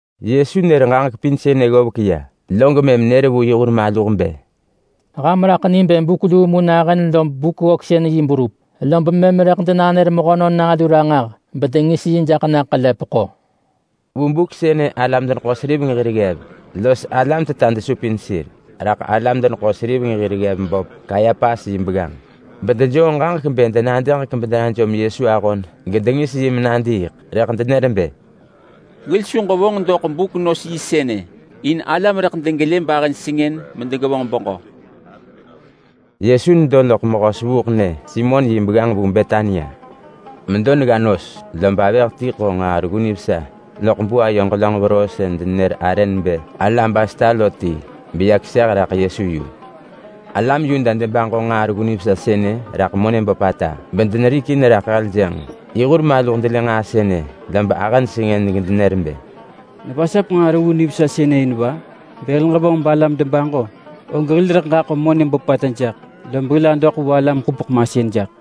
Yesu nër ġaġek pin sënë ggovek ya, log mëm nër vu yi hur maluh bë, “Ham raḳ ni bë buk luu mu nahën lob Buk-ggöksën-yi berup, lob mëm rëḳ denanër Mehönon Nalu ranġah bedengis yi jaḳ ḳelepeḳo.” Vu buk sënë alam-deneḳo-seriveng hir ggev los alam teta desupin sir raḳ alam-deneḳo-seriveng hir ggev böp Kayapas yi begganġ, bedejoo ġaġek bë denadëġek bedenajom Yesu ahon gedengis yi menadiiḳ. Rëḳ denër bë, “Hil su ġevonġ doḳ buk nos yi sënë in alam rëḳ degevonġ dedun.” Yesu nedo loḳ mehö sevuuḳnyë Simon yi begganġ vu Betania. Medo negga nos, lob avëh ti ḳo nġaa reggu nivesa loḳ buayo ġelönġ veroo sën denenër arë nebë alabasta lo ti, beya keseh raḳ Yesu yu. Alam Yuda debaġo nġaa reggu nivesa sënë raḳ monë böpata bedenerikin raḳ heljënġ. Rëḳ yi hur maluh delë nġaa sënë, lob ahëj sengën gedenër bë, “Nevasap nġaa reggu nivesa sënë in va? Bë hil ġevonġ balam debaġo, og hil rëḳ ġaḳo monë böpata jaḳ, lob hil adoḳ vu alam-ḳupeḳ-masën jaḳ.”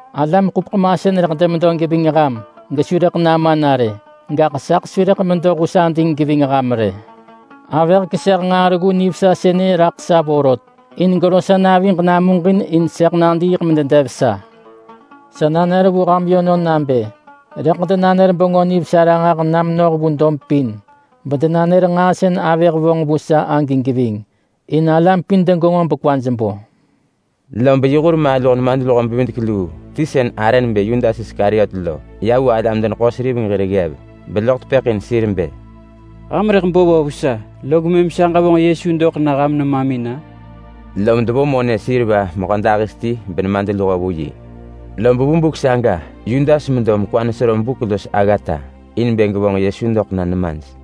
Alam-ḳupeḳ-masën rëḳ demedo geving ham gesu rëḳ nama na rë. Gaḳ saḳ su rëḳ medo hus ading geving ham rë. Avëh keseh nġaa reggu nivesa sënë raḳ sa vorot in gero sa naviġ namuġin in sëḳ nadiiḳ mededev sa. Sa nanër vu ham yönon nabë rëḳ denanër Bengö Nivesa ranġah na menoh vu dob pin bedenanër nġaa sën avëh vonġ vu sa agi geving, in alam pin degenġo bekwaj bo.” Lob yi hur maluh nemadluho-bevidek-luu ti sën arë nebë Yudas Iskariot lo ya vu alam-deneḳo-seriveng hir ggev, beloḳ tepëḳ in sir bë, “Ham rëḳ bo va vu sa log mëm sa ġevonġ Yesu doḳ na ham nemamin-a?” Lom devo monë seriva mehödahis ti benemadluho vu yi. Lob vu buk saga Yudas medo mekwa nesero buk los aggata in bë gevonġ Yesu doḳ na nemaj.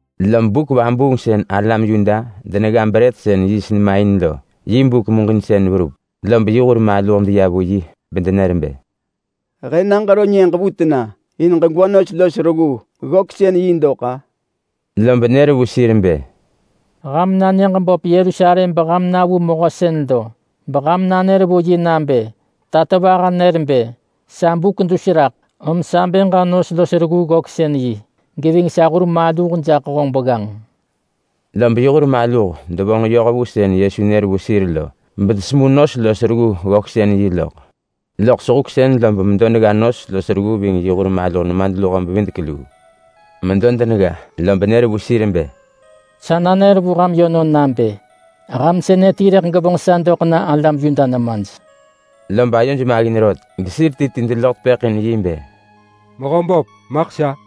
Lob buk vabuung sën alam Yuda denegga brët sën yiist nema in lo yi buk muġinsën verup, lob yi hur maluh deya vu yi bedenër bë, “He na ġero nyëġ vu tena in ġegwa nos los reggu ggöksën-yi dok-a?” Lob nër vu sir bë, “Ham na nyëġ böp Yerusalem beham na vu mehö sën lo, beham nanër vu yi nabë, ‘Tatovaha nër bë, “Sa buk dus raḳ, om sa bë ġa nos los reggu ggöksën-yi geving sa hur maluh jaḳ honġ begganġ.”’” Lob yi hur maluh devonġ yoh vu sën Yesu nër vu sir lo, bedesemu nos los reggu ggöksën-yi loḳ. Loḳ sehuksën lob medo negga nos los reggu ving yi hur maluh nemadluho-bevidek-luu. Medo denegga, lob nër vu sir bë, “Sa nanër vu ham yönon nabë: Ham sënë ti rëḳ gevonġ sa doḳ na alam Yuda nemaj.” Lob ayoj maggin rot, gesir ti ti deloḳ tepëḳ in yi bë, “Mehöböp, maḳ sa?”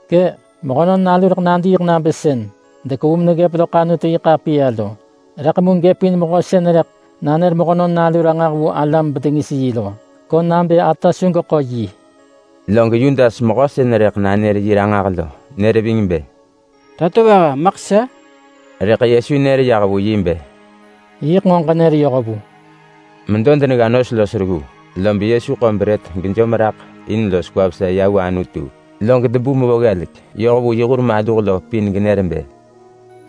Kë’! Mehönon Nalu rëḳ nadiiḳ nabë sën dekevu meneggëp loḳ Anutu-yi-ḳapiya lo. Rëḳ mu gëpin mehö sën rëḳ nanër Mehönon Nalu ranġah vu alam bedengis yi lo, ko nabë ata su geḳo yi!” Log Yudas mehö sën rëḳ nanër yi ranġah lo, nër ving bë, “Tatovaha, maḳ sa?” Rëḳ Yesu nër yah vu yi bë, “Yiḳ nġo ġenër yoh vu!” Medo denegga nos los reggu, lob Yesu ḳo brët gejom raḳ in los kwa vesa ya vu Anutu, log debu mevo ggelek yoh vu yi hur maluh pin genër bë,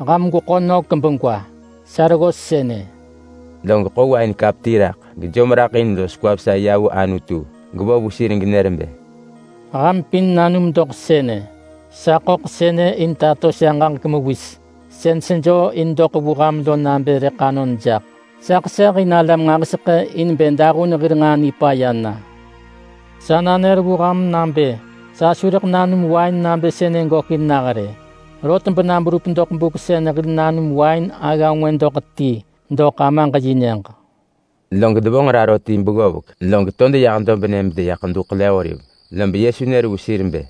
“Ham gweḳo nök begwa! Sa reggos sënë!” Log ḳo wain kap ti raḳ, gejom raḳ in los kwa vesa ya vu Anutu gevo vu sir genër bë, “Ham pin nanum doḳ sënë! Sa ḳöḳ sënë in tato sa ġaġek mewis sën sejoo in doḳ vu ham lo nabë rëḳ anon jaḳ! Sa ḳeseh in alam nġahiseḳë in bë dahun hir nġaa nipaya na. Sa nanër vu ham nabë sa su rëḳ nanum wain nabë sënë gökin nah rë. Rot bena berup doḳ buk sën hil nanum wain agga ngwë doḳ ti doḳ Amaġ yi Nyëġ.” Log devonġ raro ti beggovek, log to deyah dobnë bedeya Ḳedu Ḳele-oliv. Lob Yesu nër vu sir bë,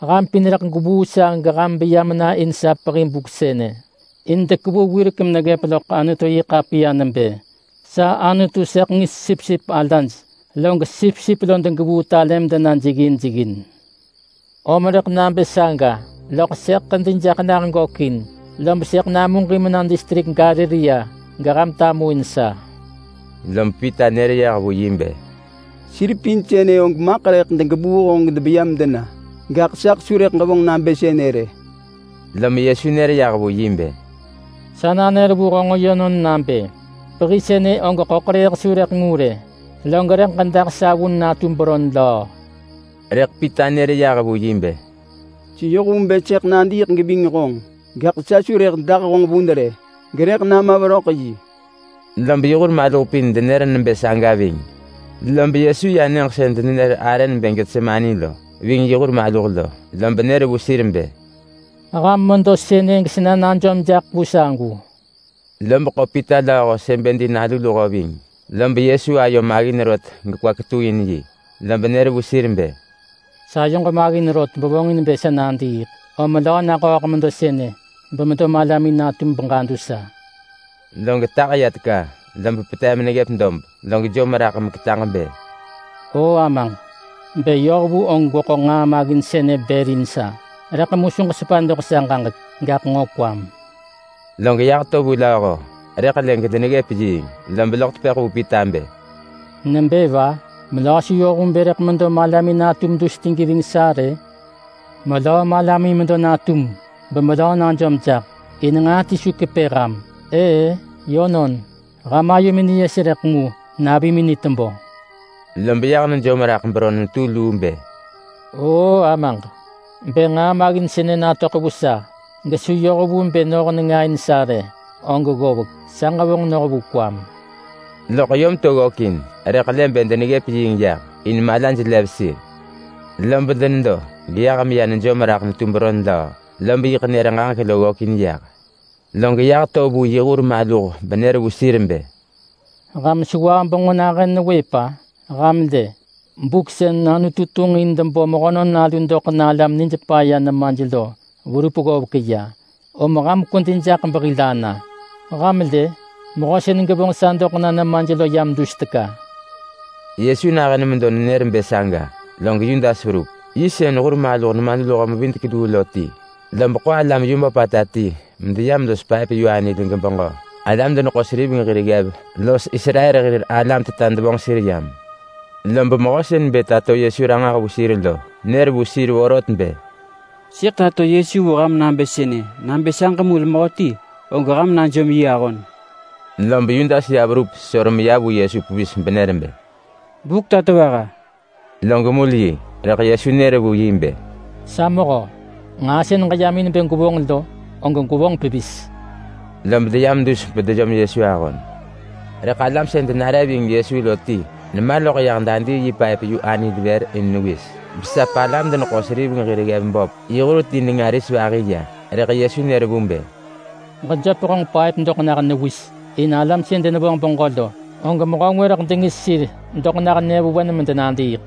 “Ham pin rëḳ gwevuu sa geham beya mena in sa pehi buk sënë. In dekevu wirek meneggëp loḳ Anutu-yi-ḳapiya nebë: ‘Sa Anutu sëḳ ngis sipsip alaj, log sipsip lo degevuu talë medena jeggin jeggin.’ Om rëḳ nabë saga, loḳ sëḳ ḳedi jaḳ nah gökin, lob sëḳ namuġin mena distrik Galilea, geham tamuin sa.” Lob Pita nër yah vu yi bë, “Sir pin sënë og maḳ rëḳ degevuu honġ bedebeya medena, gaḳ saḳ su rëḳ ġevonġ nabë sënë rë!” Lom Yesu nër yah vu yi bë, “Sa nanër vu honġ yönon nabë: Pehi sënë og ḳöḳrëëh su rëḳ ngu rë, log rëḳ ġedah sa vun natu beron löö!” Rëḳ Pita nër yah vu yi bë, “Seyoh vu bë sëḳ nadiiḳ geving honġ, gaḳ sa su rëḳ dah honġ vun rë, gerëḳ nama veröḳ yi!” Lob yi hur maluh pin denër nebë saga. Lob Yesu ya nyëġ sën denenër arë nebë Getsemane lo, ving yi hur maluh lo, lob nër vu sir bë, “Ham medo sënë gesena najom jaḳ vu sagu!” Lob ḳo Pita ving Sebedi nalu luho. Lob ayo maggin rot gekwa ketuin yi. Lob nër vu sir bë, “Sayoġ maggin rot bevonġin bë sa nadiiḳ. Om melöö naḳööḳ medo sënë bemedo malamin natum beġadu sa. Log tah ya teka, lob petev meneggëp dob, log jom raḳ meketaġ bë, “O Amaġ! Bë yoh vu og gweḳo nġaa maggin sënë bër in sa! Rëḳ mu su ġesepa doḳ sa ġaġek, gaḳ nġo kwam!” Log yah to vu lööho, rëḳ lë gedeneggëp yiing. Lob loḳ tepëḳ vu Pita bë, “Nebë va? Melöö su yoh vu bë rëḳ medo malamin natum dus ti geving sa rë? Melöö malamin medo natum bemelöö najom jaḳ, in nġaa ti su kepë ham! Ëë-ë yönon! Ham ayomin niyes rëḳ mu navimin ni tebö!” Lob yah nejom raḳ beron netu luu bë, “Oo Amaġ! Bë nġaa maggin sënë natöḳ vu sa gesu yoh vu bë noh nenga in sa rë, og ggovek, sa ġevonġ noh vu kwam.” Loḳ yom to ggökin, rëḳ lë bë deneggëp yiing yah, in malaj neggëp lo. Lob denedo geyah meya nejom raḳ netu beron löö, lob yiḳ nër ġaġek lo ggökin yah. Log yah to vu yi hur maluh benër vu sir bë, “Ham sewah benġo nahën newëp-a? Ham lë! Buk sën Anutu tunġ in debo Mehönon Nalu doḳ na alam nij paya nemaj lo verup ggovek ya, om ham kwedi jaḳ behil ana. Ham lë? Mehö sën gevonġ sa doḳ na nemaj lo yam dus raḳ!” Yesu nahën medo nenër bë saga, log Yudas verup. Yi sën hur maluh nemadluho-mevidek-luu lo ti, lob ḳo alam yu böpata ti medeyam los paëp yu anil gebeġö. Alam-deneḳo-seriveng hir ggev los Israel hir alam-teta devonġ sir yam. Lob mehö sën bë tato Yesu ranġah vu sir lo, nër vu sir vorot bë, “Sëḳ tato Yesu vu ham nabë sënë, nabë sa ġemul mehöti, og ham najom yi ahon.” Lob Yudas ya verup sesor meya vu Yesu pevis benër bë, “Buk Tatovaha!” Log mul yi. Rëḳ Yesu nër yah vu yi bë, “Sa mehö! Nġaa sën ġeyam in bë gwevonġ lo, og gwevonġ pevis!” Lob deyam dus bedejom Yesu ahon. Rëḳ alam sën denare ving Yesu lo ti nema loḳ yah dadii yi paëp-yu-anil vër in newis, besap alam-deneḳo-seriveng hir ggev böp yi hur ti nenga ris vahi ya. Rëḳ Yesu nër vu bë, “Ġejöp honġ paëp doḳ nah newis. In alam sën denevonġ beġö lo, og mehö ngwë rëḳ dengis sir doḳ nah nyëvewen medenadiiḳ.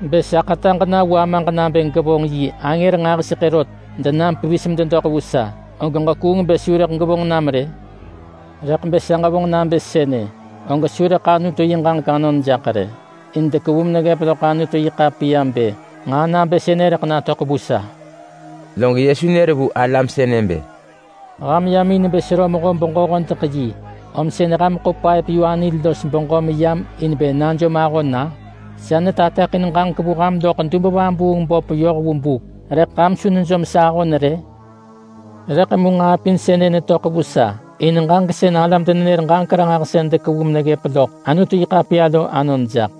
Bë sa ḳetaġ na vu Amaġ nabë gevonġ yi angër nġahiseḳë rot denam pevis mededoḳ vu sa, og ġekuung bë su rëḳ gevonġ nam rë? Rëḳ bë sa ġevonġ nabë sënë, og su rëḳ Anutu yi ġaġek anon jaḳ rë. Sën dekevu meneggëp loḳ Anutu-yi-ḳapiya bë nġaa nabë sënë rëḳ natöḳ vu sa lo.” Log Yesu nër vu alam sënë bë, “Ham yam in bë sero mehö-beġö-hodeḳ-yi om sën ham ḳo paëp-yu-anil los beġö meyam in bë najom ahon-a? Sa netateḳin ġaġek vu ham loḳ dub-vabuung-böp yoh vu buk, rëḳ ham su nejom sa ahon rë? Rëḳ mu nġaa pin sënë netöḳ vu sa in ġaġek sën alam-denenër-ġaġek-ranġahsën dekevu meneggëp loḳ Anutu-yi-ḳapiya lo anon jaḳ.”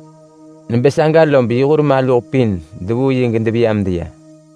Nebë saga lob yi hur maluh pin devuu yi gedeveya medeya.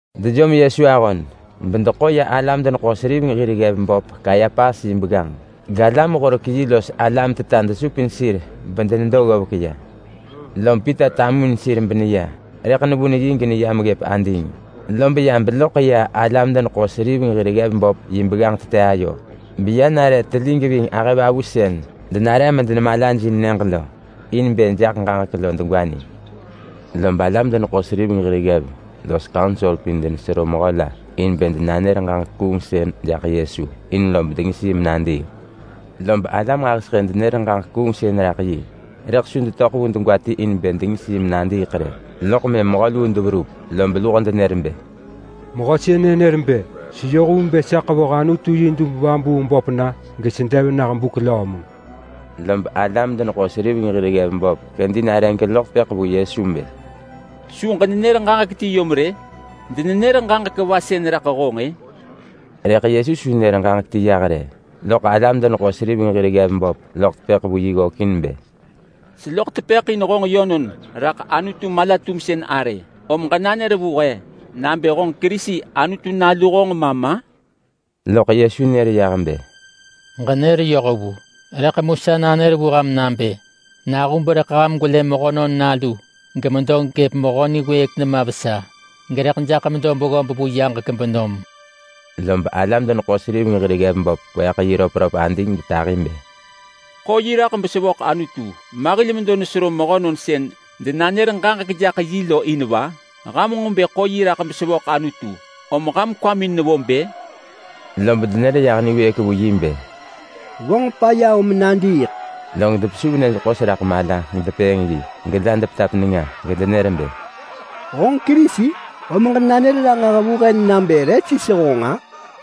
Dejom Yesu ahon bedeḳo ya alam-deneḳo-seriveng hir ggev böp Kayapas yi begganġ. Galam-horek-yi los alam-teta desupin sir bedenedo ggovek ya. Lom Pita tamuin sir beneya, rëḳ nevun yi geneyam ggëp ading. Lob ya beloḳ ya alam-deneḳo-seriveng hir ggev böp yi begganġ tete ayo, beya nare telig ving ahëvavu sën denare medenemalajin nyëġ lo, in bë jaḳ ġaġek lo degwa ni. Lob alam-deneḳo-seriveng hir ggev los kaunsor pin denesero mehö la in bë denanër ġaġek kuungsën jaḳ Yesu in lob dengis yi menadiiḳ. Lob alam nġahiseḳë denër ġaġek kuungsën raḳ yi, rëḳ su detöḳ vu degwa ti in bë dengis yi menadiiḳ rë. Loḳ mëm mehö luu deverup, lob luho denër bë, “Mehö sënë nër bë, ‘Seyoh vu bë sa ḳevoh Anutu yi dub-vabuung-böp na gesedev nah buk löö mu!’” Lob alam-deneḳo-seriveng hir ggev böp kedi nare geloḳ tepëḳ vu Yesu bë, “Su ġenenër ġaġek ti yom rë? Denenër ġaġek va sën raḳ honġ-ë?” Rëḳ Yesu su nër ġaġek ti yah rë. Loḳ alam-deneḳo-seriveng hir ggev böp loḳ tepëḳ vu yi ggökin bë, “Seloḳ tepëḳ in honġ yönon raḳ Anutu mala-tumsën arë, om ġenanër vu he nabë honġ Kerisi, Anutu nalu honġ ma ma?” Loḳ Yesu nër yah bë, “Ġenër yoh vu! Rëḳ mu sa nanër vu ham nabë: Nahub rëḳ ham gwelë Mehönon Nalu gemedo gëp Mehö Niwëëk nema vesa, gerëḳ jaḳ medo beggob vu yaġek benom!” Lob alam-deneḳo-seriveng hir ggev böp kweeḳ yi röpröp ading getahi bë, “Ḳo yi raḳ besevöḳ Anutu! Ma hil medo nesero mehönon sën denanër ġaġek jaḳ yi lo in va? Ham nġo bë ḳo yi raḳ besevöḳ Anutu! Om ham kwamin nevo bë?” Lob denër yah niwëëk vu yi bë, “Vonġ paya om nadiiḳ!” Log depesuv nyëj ḳos raḳ mala gedepëëng yi, gela depetap nenga, gedenër bë, “Honġ Kerisi? Om ġenanër ranġah vu he nabë re sis honġ-a?”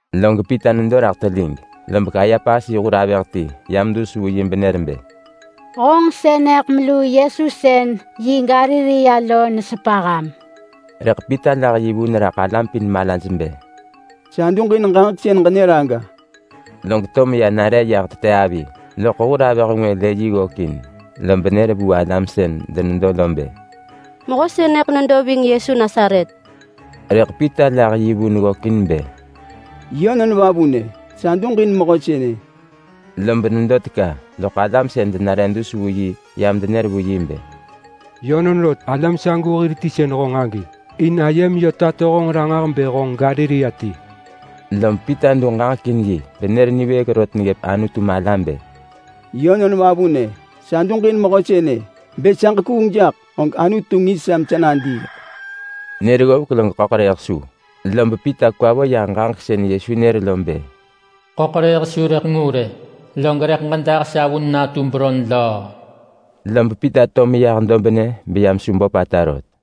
Log Pita nedo raḳ telig, lob Kayapas yi hur avëh ti yam dus vu yi benër bë, “Honġ sënëḳ melu Yesu sën vu Galilea lo nesepa ham.” Rëḳ Pita lah yi vun raḳ alam pin malaj bë, “Sa duġin ġaġek sën ġenër aga!” Log to meya nare ya tete avi, lob hur avëh ngwë lë yi ggökin, lob nër vu alam sën denedo lo bë, “Mehö sënë nedo ving Yesu Nasaret!” Rëḳ Pita lah yi vun ggökin bë, “Yönon vavunë, sa duġin mehö sënë!” Lob nedo teka, loḳ alam sën denare dus vu yi yam denër vu bë, “Yönon rot, alam sagu hir ti sën honġ agi. In ayem yö tato honġ ranġah bë honġ Galilea ti!” Lob Pita du ġaġek in yi benër niwëëk rot neggëp Anutu mala bë, “Yönon vavunë, sa duġin mehö sënë! Bë sa ġekuung jaḳ og Anutu ngis sa mesa nadiiḳ!” Nër ggovek log ḳöḳrëëh su. Lob Pita kwa vo yah ġaġek sën Yesu nër lo bë, “Ḳöḳrëëh su rëḳ ngu rë, log rëḳ ġedah sa vun natu beron löö.” Lob Pita to meyah dobnë beya mesu böpata rot.